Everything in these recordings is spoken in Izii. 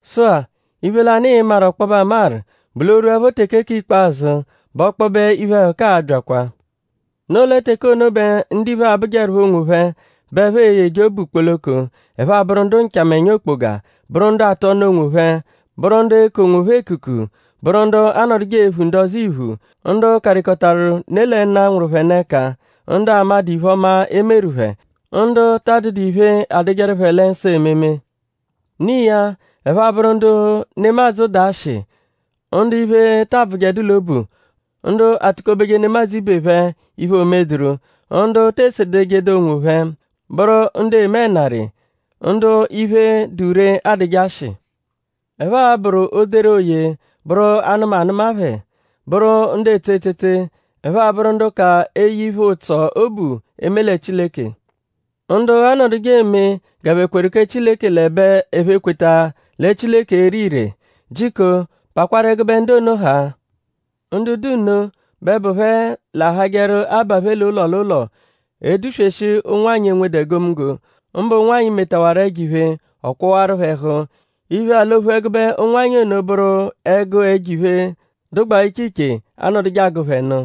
“Sụ-a; iphe lanụ, ịi-maru ọkpobe amaru bụ l'o -rwuẹpho teke k'ikpazụ bẹ ọkpobe iphe-ẹhuka a-byakwa. Noo lẹ teke ono bẹ ndiphe a-bụjeerupho onwophẹ bẹ ẹphe e-yeje obu kpoloko; ẹphe abụru ndu nchamẹnya okpoga; bụru ndu atụ ọnu onwophẹ; bụru ndu eku onwophẹ ekuku; bụru ndu anọduje ephu ndu ọzo iphu; ndu karikọtaru ne lẹ nna, nwụru phẹ nụ ẹka; ndu amadụ iphe-ọma, e meru phẹ; ndu ta adụdu iphe, adụjeru phẹ lẹ nsọ ememe. No iya; ẹphe a-bụru ndu nemadzụ dụ ashị; ndu iphe ta abvụjedu l'obu; ndu atukobeje nemadzụ ibe phẹ iphe, o medụru; ndu te esedejedu onwophẹ; bụru ndu eme ẹnari; ndu iphe, dụ ree adụje ashị. Ẹphe a-bụru o-deru-oye; bụru 'anụma anụma phẹ; bụru ndu etse etsetse; ẹphe abụru ndu ka eye iphe-ụtso obu eme lẹ Chileke; ndu anọduje eme g'ẹphe kweru kẹ Chileke l'ẹbe ẹphe ekweta lẹ Chileke ere ire. Jiko pakwarụ ẹgube ndu ono haa. “Ndu dụ nno bẹ bụ phẹ l'ahajẹru abaphe l'ụlo l'ụlo edusweshi ụnwanyi, enwedu egomunggo; mbụ ụnwanyi metawaru ẹjo-iphe; ọ kwọwaru phẹ ẹhu; iphe, l'alọ-phu ẹgube ụnwanyi ono bụru ẹgu ẹjo-iphe, dụgbaa iche iche, anọduje agụ phẹ nụ.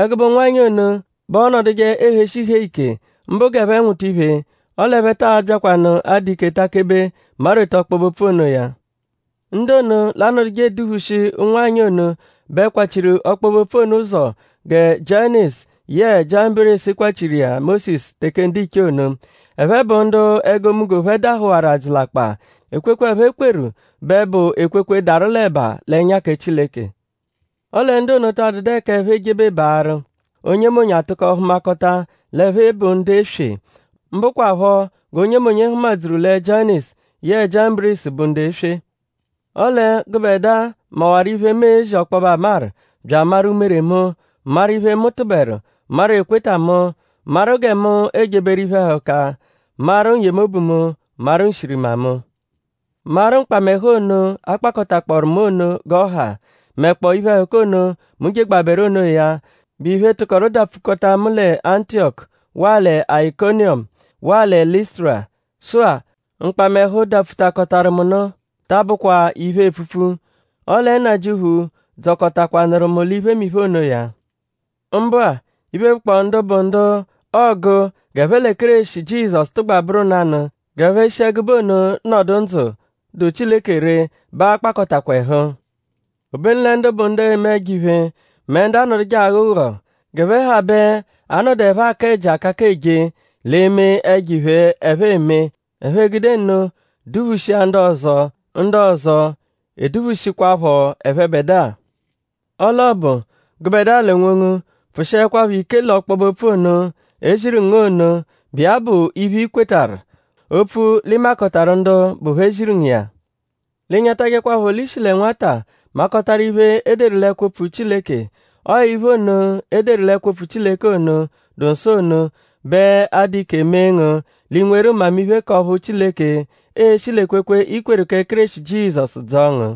Ẹgube ụnwanyi ono bẹ ọonoduje eheshi ihee ike; mbụ g'ẹphe nwụta iphe; ọle ẹphe ta abyakwanụ adụ ike takebe marweta ọkpobe-opfu onoya. Ndu ono, l'anọduje eduphushi ụnwanyi ono bẹ kwachiru ọkpobe-opfu ono ụzo gẹ Jianẹsu yẹe Jiambirisu kwachiru iya Mósisu teke ndiche ono. Ẹphe bụ ndu egomunggo phẹ dahụwaru adzụlakpa; ekwekwe, ẹphe kweru bẹ bụ ekwekwe, daru l'ẹba l'ẹnya kẹ Chileke. Ọle ndu ono ta adụdu ẹka ẹphe ejebebaaru; onyemonye atụko hụmakota l'ẹphe bụ ndu eswe; mbụkwapho g'onyemonye hụma-dzuru lẹ Jianẹsu yẹe Jiambirisu bụ ndu eswe.” “Ọle gụbedua mawaru iphe, mu ezi; ọkpobe amaru; bya amaru umere mu; maru iphe, mu tụberu; maru ekweta mu; maru gẹ mu ejeberu iphe-ẹhuka; maru n-yemobu mu; maru nshirima mu; maru mkpamẹhu ono, a kpakọtakpooru mu ono g'ọ ha; mẹkpoo iphe-ẹhuka ono, mu jegbabẹru onoya, bụ iphe, tụkoru dapfukọta mu lẹ Antiyọku; waa lẹ Ayikoniyomu; waa lẹ Lịsutura. Sụ-a; mkpamẹhu, dapfutakọtaru mu nụ ta abụkwa iphe epfupfu! Ọle Nnajịuphu dzọkotakwaru mu l'iphemiphe onoya. Mbụ-a; iphe, bụkpoo ndu bụ ndu ọogu g'ẹphe lẹ Kéreshi Jizọsu tụgba bụru nanụ; g'ẹphe shi ẹgube ono nọdu ndzụ, dụ Chileke ree bẹ aa-kpakọtakwa ẹhu. Obenu lẹ ndu bụ ndu eme ẹjo-iphe; mẹ ndu anọduje aghọ ụgho; g'ẹphe ha bẹ a-nọduepho aka ẹji akaka eje l'eme ẹjo-iphe, ẹphe eme; ẹphe egude nno duphushia ndu ọzo; ndu ọzo eduphushikwaphọ ẹphebedua. Ọle ọ bụ; gụbedua l'onwongu; pfụshiekwapho ike l'ọkpobe-opfu ono, e ziru ngu ono, bụ iya bụ iphe, i kwetarụ; opfu l'ị makọtaru ndu bụ phẹ ziru ngu iya. L'ị nyatajẹkwapho l'i shi lẹ nwata makọtaru iphe, e deru l'ẹkwo-opfu Chileke. Ọo iphe ono, e deru l'ẹkwo-opfu Chileke ono, dụ nsọ ono bẹ a-dụ ike mee ngu l'i nweru mmamiphe k'ọphu Chileke e-shi l'ekwekwe, i kweru kẹ Kéreshi Jizọsu dzọo ngu.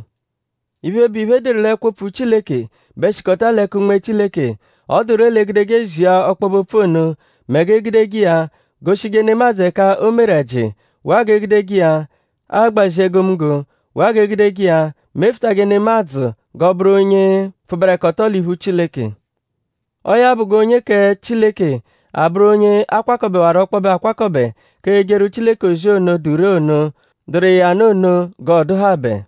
Iphe, bụ iphe, e deru l'ẹkwo-opfu Chileke bẹ shikọtakwa l'ẹka Unme Chileke. Ọ dụ ree l'egudeje zia ọkpobe-opfu ono; mẹ g'e gudeje iya goshije nemadzụ ẹka o meru ẹji; waa g'e gudeje iya agbazi egomunggo; waa g'e gude iya mefụtaje nemadzụ g'onye ọbu bụru onye pfụberekoto l'iphu Chileke. Ọo ya bụ g'onye kẹ Chileke abụru onye a kwakọbewaru ọkpobe akwakọbe k'ejeru Chileke ozi ono, dụ ree ono, dụru iya nụ ono g'ọoduhabe.”